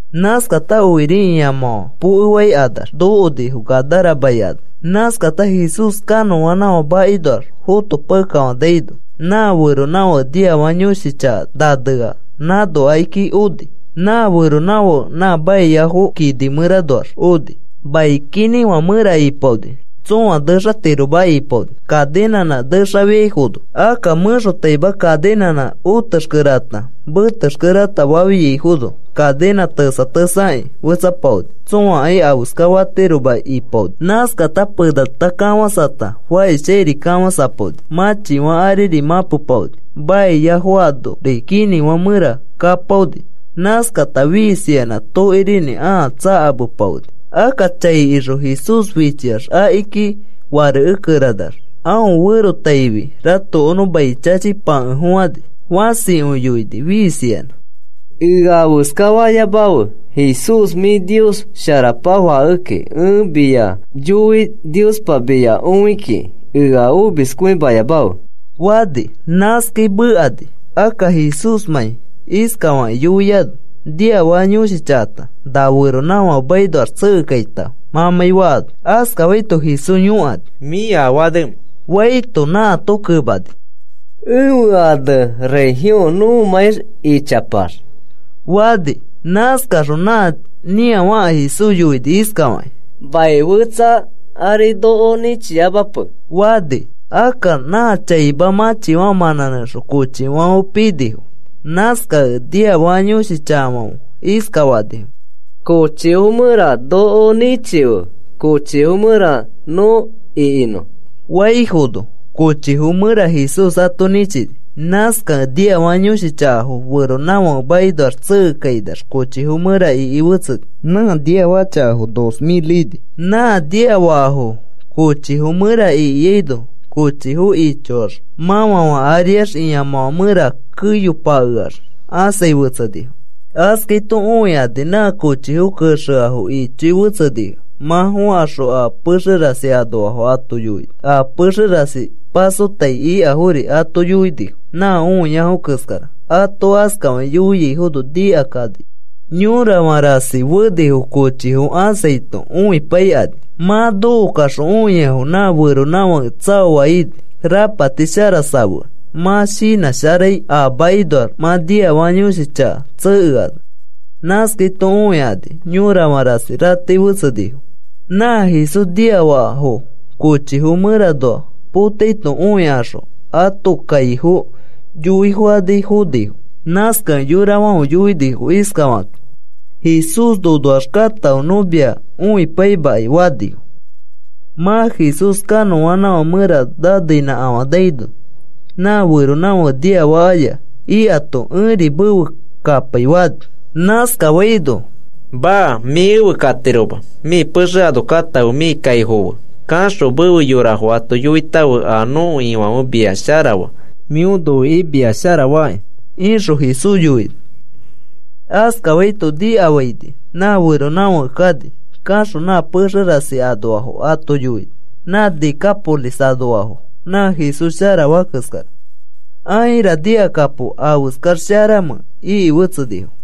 Nãskata okiri ĩamãfã pokefaikanax nokonifo, Gadara mai ano. Nãskata Jesús kanõanãfã makinoax fotopakekafanaino, nã feronãfake niafaka yõshi chaka nanea nãno akiki oni. Nã feronãfake nã maiafo kinĩfã mẽranoax oni. Mai kinĩfã mẽra ipaoni. Tsõa nexatiroma ipaoni kaninãnã nexafiaifono. Akka mẽxotaima kaninãnã otexkere ata metexkere ata fafiaifono, kaninã tesa tesa aki fetsapaoni. Tsõakai afeska fatiroma ipaoni. Nãskata penata kafãsata fakishchãiri kafãsapaoni, mãchifã ariri mãpepaoni maiafo anori kinĩfã mẽra kapaoni. Nãskata fiisiyanã tokirinĩ ãa tsakamepaoni. Akka chai ixõ Jesús fichiax, akiki farekekeranax aõ ferotaifi ratokonõ mai chachipakefofãni. Fãsikõi yoini fiisiyanã. “¡Ea afeska fayamafe, Jesús! Mĩ Nios Sharapa Fakekĩ, ẽ mia yoi Niospa mia õi kiki ea omiskõimayamafe,” fani. Nãskai mekani, akka Jesúsmãi iskafakĩ yoiano: “Niafaka yõshi chakata, na feronãfake makinoax tsekekaitãfe,” mãmãi faano. Askafaito Jesús yõkani: “¿Mĩ afe anemẽ?” faito, nãato kemani: “Ẽfe ane Legión nõmãi ichapax,” fani. Nãskaxõ nã nĩafaka Jesús yoini iskafakĩ: “Mai fetsa ari noko nĩchiyamape,” fani. Akka nã chaima mãchifã mãnãnẽxõ kochifãfe pinifo. Nãskakẽ niafaka yõshi chakafãfe iskafanifo: “Kochifo mẽra noko nĩchife, kochifo mẽra nõ ikinõ,” faifono, kochifo mẽra Jesús ato nĩchini. Nãskakẽ niafaka yõshi chakafo feronãfake makinoax tsekekainax kochifo mẽra iki fetseni. Nã niafaka chakafo dos mil ini. Nã niafakafo kochifo mẽra ikiano kochifo ichoax mãfãfã ariax ĩamãfã mẽra keyopakeax ãsai fetsenifo. Askaito õikani nã kochifo kexeafo ichoi fetsenifo. Mã fokaxõ a pexe rasi anoafo ato yoinifo, a pexe rasi pasotai ikafori ato yoinifo nã õiafo keskara. Ato askafakĩ yoiaifono nikakani yõrafã rasi fenifo kochifo ãsaito õipaikani. Mã nokokaxõ õiafo nã feronãfake tsaoa ini rapati shara safeax, mã shinãsharai a makinoax mã niafaka yõshi chaka tsekeano. Nãskaito õikani yõrafã rasi ratei fetsenifo. Nã Jesús niafakafo kochifo mẽranoa potaito õikaxõ ãto kaifo yoifokani fonifo. Nãskakẽ yorafãfe yoinifo iskafakakĩ: “Jesús, nonoax katãfe, nõ mia õipaimakai,” fanifo. Mã Jesús kanõanãfã mẽra naneinãkafanaino, nã feronãfake niafakaya ikato, “Ẽri mefe kapai,” fani. Nãskafaino, “Maa, mĩ efe katiroma. Mĩ pexe ano katãfe. Mĩ kaifofo fe kaxõ mefe yorafo ato yoitãfe a nõko Ifãfe mia sharafa, mĩo noikĩ mia sharafaki,” ixõ Jesús yoini. Askafaito nikafaini nã feronãfake kani. Kaxõ nã pexe rasi anoafo ato yoini, nã Decápolis anoafo nã Jesús sharafaa keskara. “Aira, nikakapo, ¿afeskax sharamẽ?” iki fetsenifo.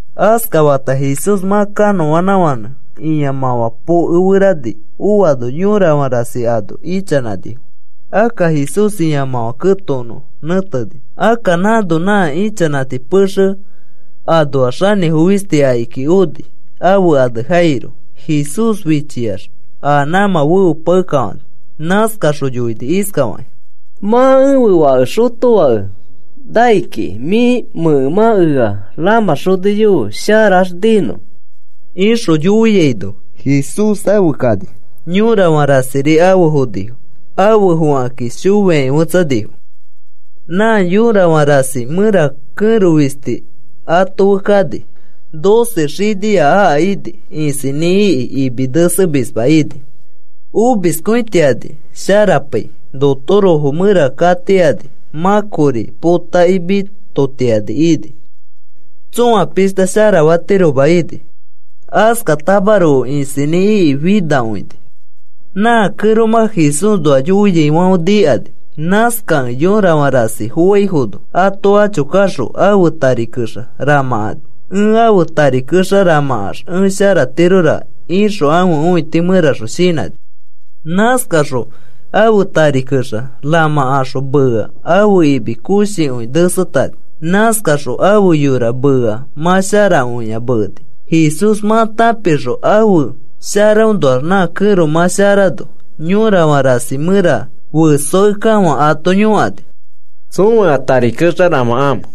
Askafata Jesús mã kanõanãfãnẽ ĩamãfã pokeferani oano yõrafã rasi ano ichanãnifo. Akka Jesús ĩamãfã ketokonõ nẽteni. Akka nãno nã ichanãti pexe anoa xanĩfo fisti akiki oni, ãfe ane Jairo. Jesús fichiax a nãmã feopakekafani. Nãskaxõ yoini iskafakĩ: “Mã ẽfe fake xotofake nai kiki. Mĩ mẽkemã ea rãmãxoniyofe, sharax ninõ,” ixõ yoiaino, Jesús afe kani, yõrafã rasiri afe fonifo. Afe fokakĩ shoiakĩ fetsanifo. Nã yõrafã rasi mẽra kẽro fisti ato fe kani, doce xinia aka ini isinĩ iki, imi nesemisma ini. Omiskõitiani sharapai notorofo mẽra katiani, mã kori potakĩ mitotiani ini. Tsõa pishta sharafatiroma ini, askatamaroko isinĩ iki finakõini. Nã kẽromã Jesúsnoa yoiaifãfe nikani. Nãskakẽ yõrafã rasi foaifono ato acho kaxõ ãfe tari kexa ramãkani. “Ẽ ãfe tari kexa ramãkax ẽ sharatiroraka,” ixõ ãfe õiti mẽraxõ shinãni. Nãskaxõ ãfe tari kexa ramãkaxõ meea ãfe imi koshikõi nesetani. Nãskaxõ ãfe yora meea mã sharakõia meeni. Jesús mã tãpixõ ãfe sharaõnoax nã kẽro mã sharano, yõrafã rasi mẽra fesoakekafã ato yõkani: “¿Tsõa ea tari ramãkamẽ?”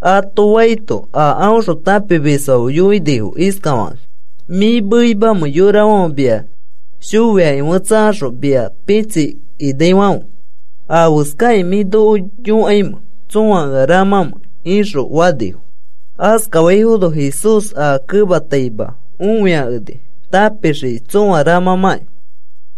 ato faito, a aõxõ tãpimisfãfe yoinifo iskafakakĩ: “¿Mĩ meimamẽ yorafãfe mia shoiakifetsakaxõ mia pitsikinaifãfe? ¿Afeskakĩ mĩ noko yõkaimẽ tsõa ea ramãmẽ?” ixõ fanifo. Askafaifono Jesús aa kemataima õiakeni, tãpixiki tsõa ramãmãkĩ.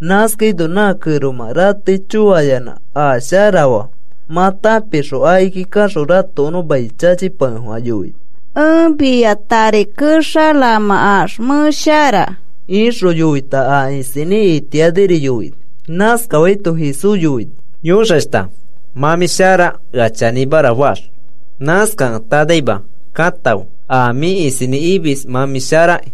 Nãskaino nã kẽromã ratei choayanã a sharafaa mã tãpixõ, akiki kaxõ ratokonõ mai chachipakefofã yoini: “Ẽ mia tari kexa ramãkax mẽ shara,” ixõ yoita a isinĩ itianiri yoini. Nãskafaito Jesús yoini: “Yõxashta, mã mĩ shara ea chanĩmara faax. Nãskakẽ tanaima katãfe a mĩ isinĩ imis mã mĩ sharaki,”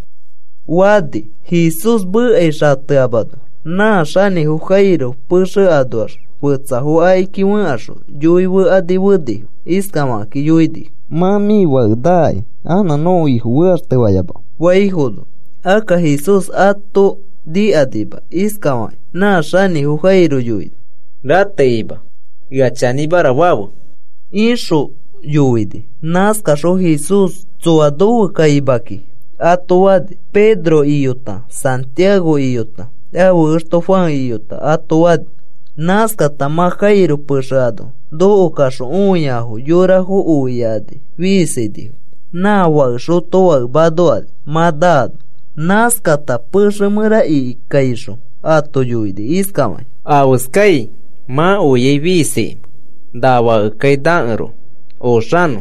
fani. Jesús mekai xateamano nã xanĩfo Jairo pexe anoax fetsafo akiki fẽkaxõ yoifekani fenifo. Iskafakĩ yoinifo: “Mã mĩ fake naaki anã nõko Ifo fekaxtefayamafe,” faifono, akka Jesús ato nikakima, iskafakĩ nã xanĩfo Jairo yoini: “Ratekima, ea chanĩmara fafe,” ixõ yoini. Nãskaxõ Jesús, “Tsoa nofe kaima kiki,” ato fani. Pedro iyota, Santiago iyota, ãfe exto Juan iyota ato fani. Nãskata mã Jairo pexe ano nokokaxõ õiafo yorafo oiakani fiisinifo nã fake xotofake manokani mã naano. Nãskata pexe mẽra ikikaixõ ato yoini iskafakĩ: “¿Afeskai mã oiai fiisikimẽ? Na fakekai nakeroko oxanõ,”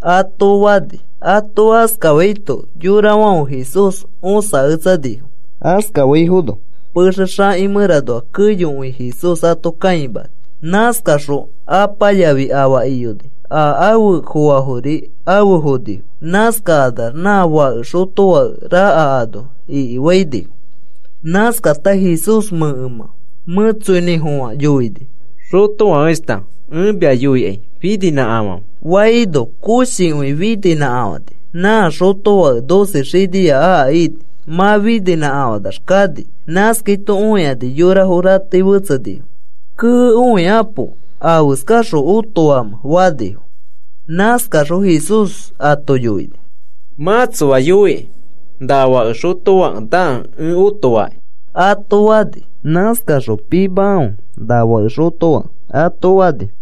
ato fani. Ato askafaito yorafãfe Jesús õsaketsanifo. Askafaifono pexe xaki mẽranoa keyokõi Jesús ato kãimani. Nãskaxõ apa yafi afa iyoni, a afe foafori afe fonifo. Nãskakanax nã fake xotofake raka ano ikifainifo. Nãskata Jesús mẽkemã mẽtsoinĩfofã yoini: “Xotofakeshta, ẽ mia yoikai fininĩkafãfe,” faino, koshikõi fininĩkafãni, nã xotofake doce xinia aka ini. Mã fininãkafãnax kani. Nãskaito õikani yorafo ratei fetsenifo. “¡Kee, õikapo! ¿Afeskaxõ otofamẽ?” fanifo. Nãskaxõ Jesús ato yoini: “Mã tsoa yoiki na fake xotofake nakẽ ẽ otofakĩ,” ato fani. Nãskaxõ, “Pimakãfe na fake xotofake,” ato fani.